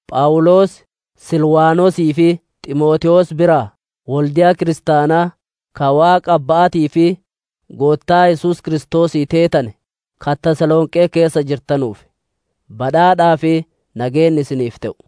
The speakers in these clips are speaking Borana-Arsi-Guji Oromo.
Phawuloos, Silwaanosii fi Ximootewoos biraa: Wolde'a kiristaanaa, ka Waaqa Abba'aatii fi Goottaa Yesuus Kiristoosii teetane, ka Tasalonqee keessa jirtanuuf: Badhaadhaa fi nageenni isiniif te'u.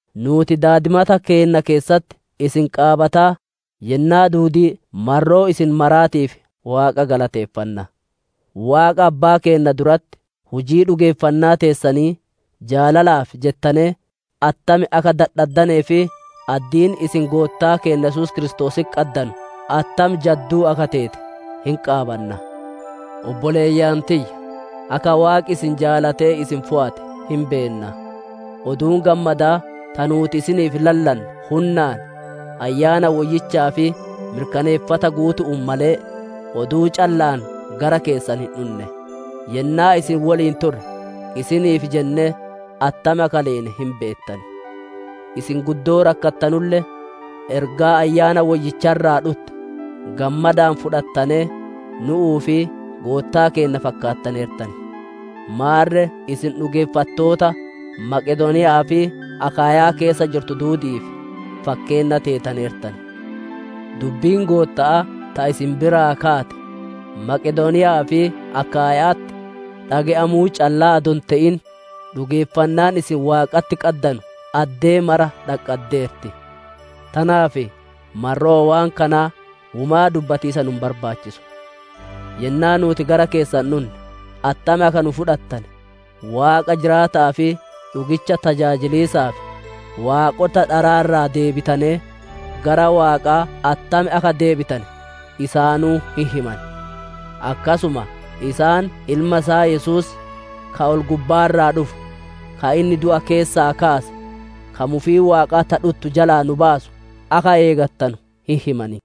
Nuuti daadimata keenna keessatti isin qaabataa, yennaa duudii marroo isin maraatiif Waaqa galateeffanna. Waaqa Abbaa keennaa duratti hujii dhugeeffannaa teessanii, jaalalaaf jettanee attam akka dadhaddanee fi addiin isin Goottaa keenna Yesuus Kiristoositti qaddanu attam jadduu akka teete hin qaabanna. Obboleeyyan tiyya, akka Waaqi isin jaalatee isin fooyate hin beenna. Oduun Gammadaa ta nuuti isiniif lallanne hunnaan, Ayyaana Woyyichaa fi mirkaneeffata guutu'uun malee, oduu calla'aan gara keessan hin dhunne. Yennaa isin woliin turre, isiniif jennee attam akka leene hin beettan. Isin guddoo rakkattanulle, ergaa Ayyaana Woyyicha irraa dhutte gammadaan fudhattanee, nu'uu fi Goottaa keenna fakkaattaneertan. Maarre isin dhugeeffattoota Maqedooniya'aa fi Akaayyaa keessa jirtu duudi'iif fakkeenna teetaneertan. Dubbiin Gootta'aa ta isin biraa kaate, Maqedooniya'aa fi Akaayya'atti dhage'amuu callaa adoo hin te'in, dhugeeffannaan isin Waaqatti qaddanu addee mara dhaqqaddeerti. Tanaaf marroo waan kanaa womaa dubbatiisa nu hin barbaachisu. Yennaa nuuti gara keessan dhunne attam akka nu fudhattane, Waaqa jiraata'aa fi dhugicha tajaajiliisaaf, waaqota dharaa irraa deebitanee, gara Waaqaa attam akka deebitane isaanuu hin himan. Akkasuma isaan Ilma isaa Yesuus, ka ol-gubbaa irraa dhufu, ka inni du'a keessaa kaase, ka mufii Waaqaa ta dhuttu jalaa nu baasu akka eegattanu hin himan.